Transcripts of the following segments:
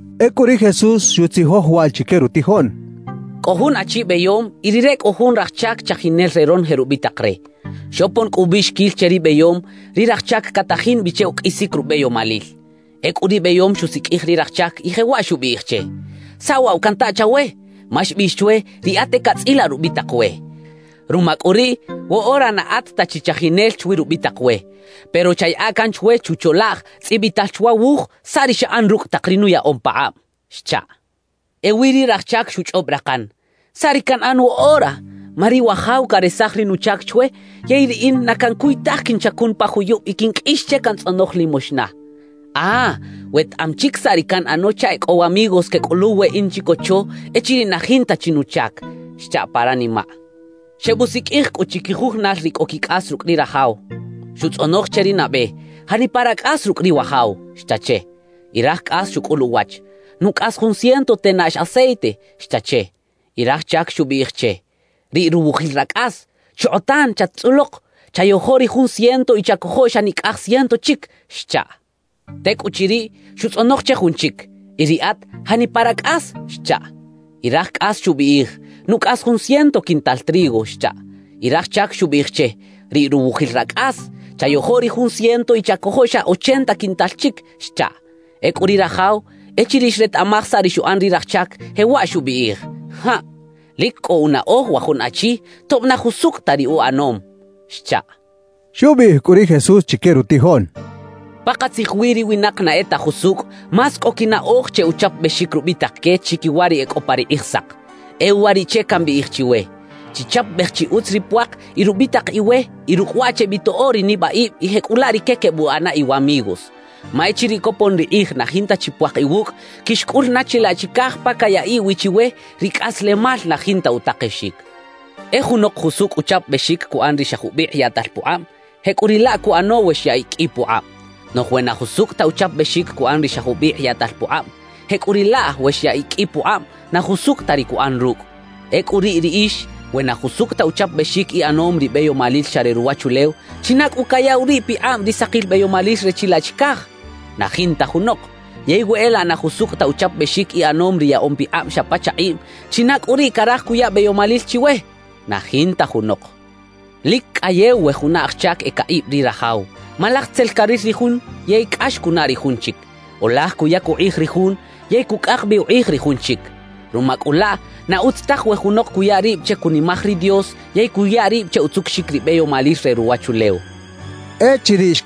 Ecꞌu ri Jesús xutzijoj waꞌ chique rutijoꞌn: «Cꞌo jun achi beyom y rire cꞌo jun raj chac chajinel re ronoje rubitak re. Xopon cꞌu ubiꞌxiquil che ri beyom, ri raj chac catajin bi che uqꞌuisic rubeyomalil. Ecꞌu ri beyom xusiqꞌuij ri raj chac y jewaꞌ xubiꞌij che: “¿Saꞌ waꞌ wa canta chawe? Ma xbiꞌx chwe, riꞌat e catzꞌilaꞌ rubitak we. Ruma cꞌu riꞌ, woꞌora na at ta chi chajinel chwi rubitak we, pero chayaꞌa can chwe chucholaꞌj tzꞌibital chwa wuj saꞌ ri xaꞌan rucꞌ tak ri nuyaꞌom pakꞌab” xchaꞌ. »Ewi ri raj chac xuchꞌob rakan: “¿Saꞌ ri canꞌan woꞌora? Ma ri wajaw caresaj ri nuchac chwe. Yey riꞌin na cancuy taj quinchacun pa juyub y quinqꞌuix che cantzꞌonoj limoxna. ¡Ah! Wetaꞌam chic saꞌ ri canꞌano chaꞌ e cꞌo wamigos quecꞌuluw weꞌin chicocho echiriꞌ na jinta chi nuchac” xcha pa ranimaꞌ. »Xebusiqꞌuij cꞌu chiquijujunal ri cꞌo quicꞌas rucꞌ ri rajaw. Xutzꞌonoj che ri nabe: “¿Janipa racꞌas rucꞌ ri wajaw?” xcha che. »Y raj cꞌas xucꞌul uwach: “Nucꞌas jun ciento tenaꞌx aceite” xcha che. »Y raj chac xubiꞌij che: “Riꞌ ruwujil racꞌas. Chokꞌotan chat-tzꞌulok, chayojo ri jun ciento y chacojo xa nicꞌaj ciento chic” xchaꞌ. »Tecꞌuchiriꞌ, xutzꞌonoj che jun chic: “Y riꞌat, ¿janipa racꞌas?” xchaꞌ. »Y raj cꞌas xubiꞌij: “Nucꞌas jun ciento quintal trigo” xchaꞌ. »Y raj chac xubiꞌij che: “Riꞌ ruwujil racꞌas. Chayojo ri jun ciento y chacojo xa ochenta quintal chic” xchaꞌ. »Ecꞌu ri rajaw, echiriꞌ xretaꞌmaj saꞌ ri xuꞌan ri raj chac, jewaꞌ xubiꞌij: “¡Jaꞌ! ¡Lic cꞌo unaꞌoj wa jun achi, tob na jusucꞌ ta ri uꞌanom!” xchaꞌ.» Xubiꞌij cꞌu ri Jesús chique rutijoꞌn: «Pakatzij wi ri winak na e ta jusucꞌ, más cꞌo quinaꞌoj che uchapabexic rubitak que, chiquiwa ri e cꞌo pa ri Kꞌijsak. E uwariꞌche cambiꞌij chiwe: Chichapabej chi utz ri puak y rubitak iwe y rucꞌ waꞌ chebitoꞌo ri nibaꞌib y jecꞌulaꞌ rique quebuꞌana iwamigos. Ma echiriꞌ copon ri kꞌij na jinta chi puak iwucꞌ, quixcꞌul na chilaꞌ chicaj pa cayaꞌiꞌ wi chiwe ri cꞌaslemal na jinta utakexic. »E junok jusucꞌ uchapabexic cuꞌan ri xa jubikꞌ yaꞌtal pukꞌab, jecꞌuriꞌlaꞌ cuꞌano we xyaꞌiꞌ qꞌui pukꞌab. Noꞌj we na jusucꞌ ta uchapabexic cuꞌan ri xa jubikꞌ yaꞌtal pukꞌab, jecꞌuriꞌlaꞌ we xyaꞌiꞌ qꞌui pukꞌab, na jusucꞌ ta ri cuꞌan rucꞌ. Ecꞌu riꞌ riꞌix, we na jusucꞌ ta uchapabexic iꞌanom ri beyomalil xa re ruwachulew, ¿china cꞌu cayaꞌw riꞌ pikꞌab ri sakil beyomalil re chilaꞌ chicaj? Na jinta junok. Yey we e laꞌ na jusucꞌ ta uchapabexic iꞌanom ri yaꞌom pikꞌab xa pa chakꞌiꞌm, ¿china cꞌu riꞌ caraj cuya beyomalil chiwe? Na jinta junok. »Lic cꞌayew we juna aj chac e caꞌib ri rajaw. Ma laj tzel caril ri jun yey cꞌax cunaꞌ ri jun chic; o laj cuyac ukꞌij ri jun yey cucꞌak bi ukꞌij ri jun chic. Ruma cꞌu laꞌ, na utz taj we junok cuya rib che cunimaj ri Dios yey cuya rib che utzucuxic ri beyomalil re ruwachulew» xcha ri Jesús.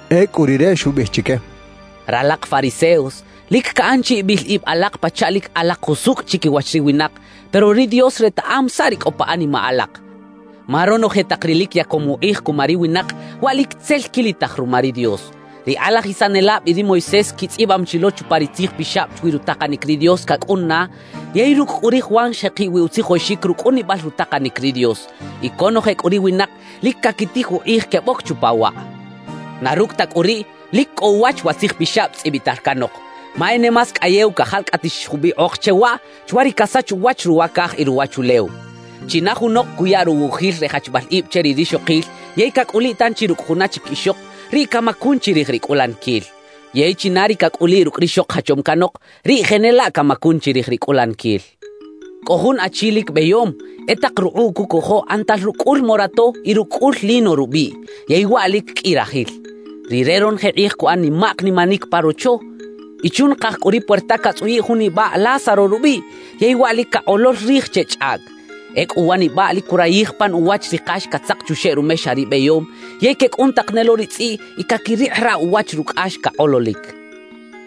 Ecꞌu Rire xubiꞌij chique: «Ralak fariseos, lic caꞌan chi ibil ib alak pachaꞌ lic alak jusucꞌ chiquiwach ri winak, pero ri Dios retaꞌam saꞌ ri cꞌo pa animaꞌ alak. Ma ronoje tak ri lic yacom ukꞌij cuma ri winak, waꞌ lic tzel quilitaj ruma ri Dios. »Ri kꞌalajisanelab y ri Moisés quitzꞌibam chi lo chupa ri Tzij Pixab chwi rutakanic ri Dios cacꞌun na; yey rucꞌ cꞌu ri Juan xjekiꞌ wi utzijoxic rucꞌunibal rutakanic ri Dios, y conoje cꞌu ri winak lic caquitij ukꞌij queboc chupa waꞌ. Na rucꞌ ta cꞌu riꞌ, lic cꞌo uwach wa Tzij Pixab tzꞌibital canok, ma e ne más cꞌayew cajalcꞌatix jubikꞌok che waꞌ chwa ri casach uwach ruwa caj y ruwachulew. »China junok cuya ruwujil re jachbal ib che ri rixokil yey cacꞌuliꞌ tanchi rucꞌ juna chic ixok, riꞌ camacun chirij ri cꞌulaniquil. Yey china ri cacꞌuliꞌ rucꞌ rixok jachom canok, riꞌ jenelaꞌ camacun chirij ri cꞌulaniquil. »Cꞌo jun achi lic beyom, e tak rukꞌuꞌ cucojo ꞌanatal rucꞌ cꞌul morato y rucꞌ cꞌul lino rubiꞌ, yey waꞌ lic qꞌui rajil. Rire ronoje kꞌij cuꞌan nimak nimanic pa rocho. Y chunakaj cꞌu ri puerta catzꞌuyiꞌ jun nibaꞌ Lázaro rubiꞌ yey waꞌ lic cakꞌolol rij che chꞌaꞌc. Ecꞌu wa nibaꞌ lic curayij pan uwach ri kax catzak chuxeꞌ rumexa ri beyom; yey quecꞌun tak ne lo ri tzꞌiꞌ y caquirikꞌiraꞌ uwach rucꞌax cakꞌololic.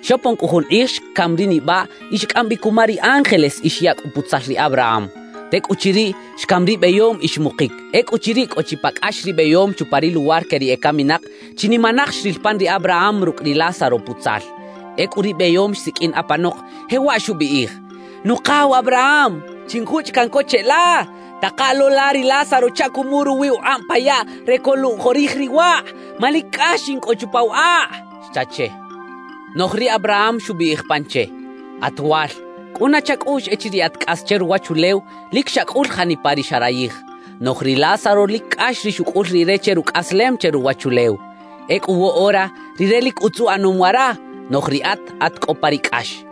»Xopon cꞌu jun kꞌij xcam ri nibaꞌ y xcꞌam bi cuma ri ángeles y xyaꞌ cꞌu putzal ri Abraham. Tecꞌuchiriꞌ, xcam ri beyom y xmukic. »Ecꞌuchiriꞌ cꞌo chi pa cꞌax ri beyom chupa ri luwar que ri ecaminak, chinimanaj xril pan ri Abraham rucꞌ ri Lázaro putzal. Ecꞌu ri beyom xsiqꞌuin apanok, jewaꞌ xubiꞌij: “Nukaw Abraham, chinjuchꞌ caꞌn co cheꞌla, taka lo la ri Lázaro chaꞌ cumuꞌ ruwi ukꞌab pa yaꞌ re coluꞌjorij ri wakꞌ, ma lic cꞌax in cꞌo chupa wa akꞌ” xcha che. »Noꞌj ri Abraham xubiꞌij pan che: “At wal, cꞌuna chacꞌuꞌx echiriꞌ at cꞌas che ruwachulew, lic xacꞌul janipa ri xarayij; noꞌj ri Lázaro lic cꞌax ri xucꞌul rire che rucꞌaslem che ruwachulew. Ecꞌu woꞌora rire lic utz uꞌanom wara, noꞌj riꞌat at cꞌo pa ri cꞌax.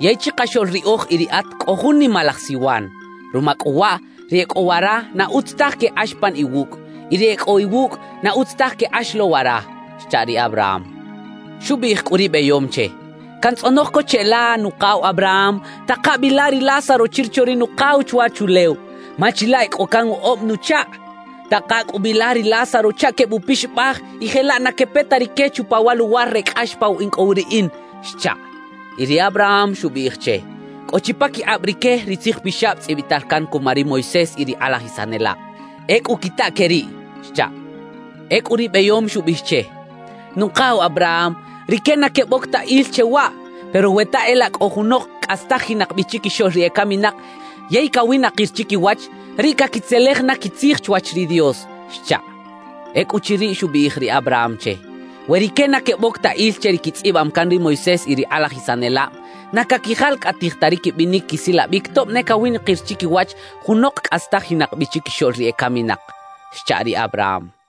Yey chikaxoꞌl riꞌoj y riꞌat cꞌo jun nimalaj siwan. Ruma cꞌu waꞌ, ri e cꞌo wara na utz taj quekꞌax pan iwucꞌ; y ri e cꞌo iwucꞌ, na utz taj quekꞌax lo wara” xcha ri Abraham. »Xubiꞌij cꞌu ri beyom che: “Cantzꞌonoj co cheꞌla, nukaw Abraham, taka bi la ri Lázaro chirocho ri nukaw chwachulew, ma chilaꞌ e cꞌo can woꞌob nuchakꞌ. Taka cꞌu bi la ri Lázaro chaꞌ quebuꞌpixabaj y jelaꞌ na quepe ta rique chupa wa luwar re cꞌax pa wa in cꞌo wi riꞌin” xchaꞌ. »Y ri Abraham xubiꞌij che: “Cꞌo chi paquikꞌab rique ri Tzij Pixab tzꞌibital can cuma ri Moisés y ri kꞌalajisanelab. ¡Ecꞌu quita que riꞌ!” xchaꞌ. »Ecꞌu ri beyom xubiꞌij che: “Nukaw Abraham, rique na queboc ta il che waꞌ. Pero we ta e laꞌ cꞌo junok cꞌastajinak bi chiquixoꞌl ri ecaminak yey cawinakir chiquiwach, riꞌ caquitzelej na quitzij chwach ri Dios” xchaꞌ. »Ecꞌuchiriꞌ xubiꞌij ri Abraham che: “We rique na queboc ta il che ri quitzꞌibam can ri Moisés y ri kꞌalajisanelab, na caquijalcꞌatij ta ri quibinic quisilabic tob ne cawinakir chiquiwach junok cꞌastajinak bi chiquixoꞌl ri ecaminak” xcha ri Abraham.»